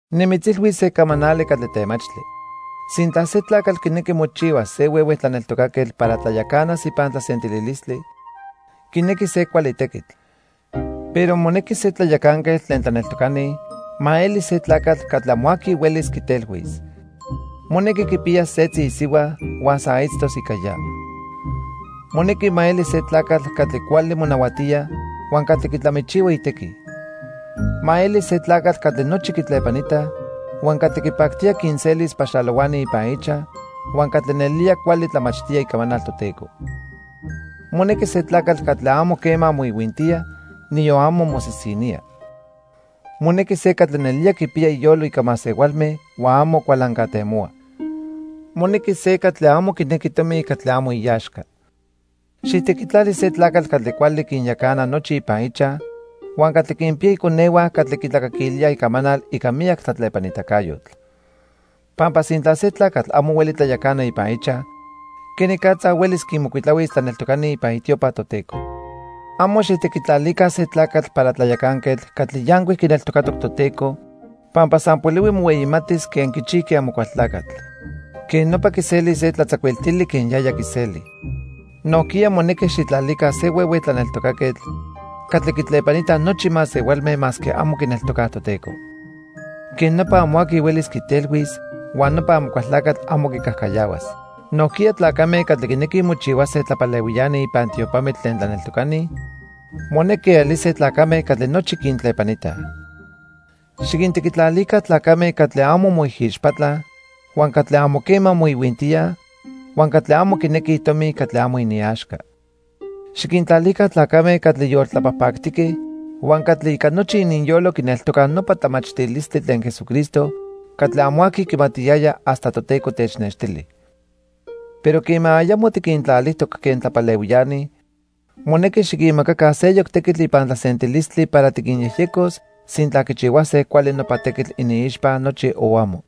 Nimitzilhuis se camanali catli temachtli. Sintla se tlacatl quinequi mochihuas se huehue tlaneltocaquetl para tlayacanas ipan tlasentililistli, quinequi se cuali tequitl. Pero monequi se tlayacanquetl tlen tlaneltocani ma eli se tlacatl catli amo aqui huelis quitelhuis. Monequi quipiyas setzi isihua huan san itztos ica ya. Monequi ma eli se tlacatl catli cuali monahuatía huan catli quitlamichihua itequi. Ma eli se tlacatl catli nochi quitlepanitaj, huan catli quipactía quinselis paxalohuani ipan ichaj huan catli nelía cuali tlamachtía icamanal Toteco. Monequi se tlacatl catli amo quema moihuintía, niyon amo mosisinía. Monequi se catli nelía quipiya iyolo ica masehualme huan amo cualancatemohua. Monequi se catli amo quinequi tomi catli amo iaxca. Xijtequitlali se tlacatl catli cuali quinyacana nochi ipan ichaj huan catli quinpiya iconehua catli quitlacaquilíaj icamanal ica miyac tlatlepanitacayotl. Pampa sintla se tlacatl amo hueli tlayacana ipan ichaj, quenicatza huelis quinmocuitlahuis tlaneltocani ipan itiopa Toteco. Amo xijtequitlalica se tlacatl para tlayacanquetl catli yancuic quineltocatoc Toteco pampa san polihui mohueyimatis quen quichijqui Amocualtlacatl. Quej nopa quiselis se tlatzacuiltili quen yaya quiseli. Nojquiya monequi xijtlalica se huehue tlaneltocaquetl catli quitlepanitaj nochi masehualme masque amo quineltocaj Toteco. Quej nopa amo aqui huelis quitelhuis huan nopa Amocualtlacatl amo quicajcayahuas. Nojquiya tlacame catli quinequij mochihuase tlapalehuiani ipan tiopamitl tlen tlaneltocani monequi elise tlacame catli nochi quintlepanitaj. Xiquintequitlalica tlacame catli amo moijixpatlaj, huan catli amo quema moihuintíaj huan catli amo quinequij tomi catli amo iniaxca. Xiquintlalica tlacame catli yoltlapajpactique huan catli ica nochi ininyolo quineltocaj nopa tlamachtilistli tlen Jesucristo catli amo aqui quimatiyaya hasta Toteco technextili. Pero quema ayamo tiquintlalijtoc quen tlapalehuiani, monequi xiquinmacaca seyoc tequitl ipan tlasentilistli para tiquinyejyecos sintla quichihuase cuali nopa tequitl iniixpa nochi, o amo.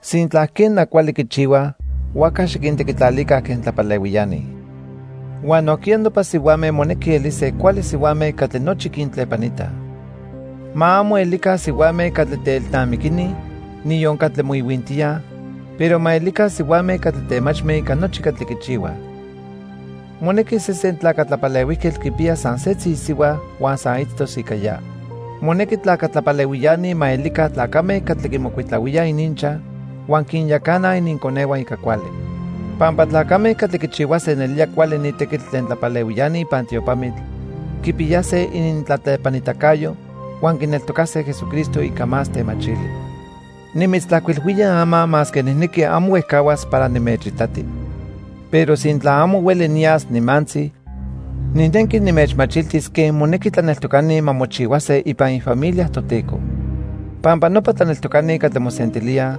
Sintla, quena, cuali quichihuaj, huajca xiquintequitlalica quen tlapalehuiani. Huan nojquiya nopa sihuame monequi elise cuali sihuame catli nochi quintlepanitaj. Ma amo elica sihuame catli teelnamiquini, niyon catli moihuintíaj, pero ma elica sihuame catli temachme ica nochi catli quichihuaj. Monequi sesen tlaca tlapalehuijquetl quipiyas san setzi isihua huan san itztos ica ya. Monequi tlaca tlapalehuiani ma elica tlacame catli quimocuitlahuíaj ininchaj huan quinyacanaj ininconehua ica cuali. Pampa tlacame catli quichihuase nelía cuali ni tequitl tlen tlapalehuiani ipan tiopamitl quipiyase inintlatlepanitacayo huan quineltocase Jesucristo ica más temachili. Nimitztlajcuilhuía ama masque nijnequi amo huejcahuas para nimechitati. Pero sintla amo hueli niyas nimantzi, nijnequi nimechmachiltis quen monequi tlaneltocani ma mochihuase ipan ifamilia Toteco. Pampa nopa tlaneltocani catli mosentilíaj,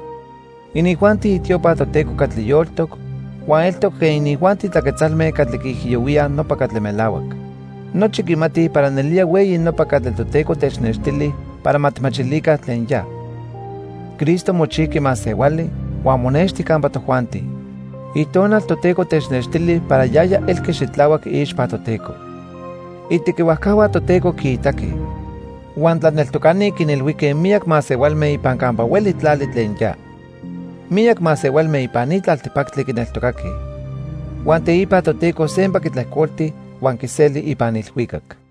inijuanti itiopa Toteco catli yoltoc huan eltoc quen inijuanti tlaquetzalme catli quiijiyohuíaj nopa catli melahuac. Nochi quimatij para nelía hueyi nopa catli Toteco technextili para ma tijmachilica tlen ya: Cristo mochijqui masehuali huan monexti campa tojuanti. Itonal Toteco technextili para yaya elqui xitlahuac iixpa Toteco. Itequihuajcahua Toteco quiitaque. Huan tlaneltocani quinilhuijque miyac masehualme ipan campa hueli tlali tlen ya. Miyac masehualme ipan ni tlaltipactli quineltocaque. Huan teipa Toteco sempa quitlejcolti huan quiseli ipan ilhuicac.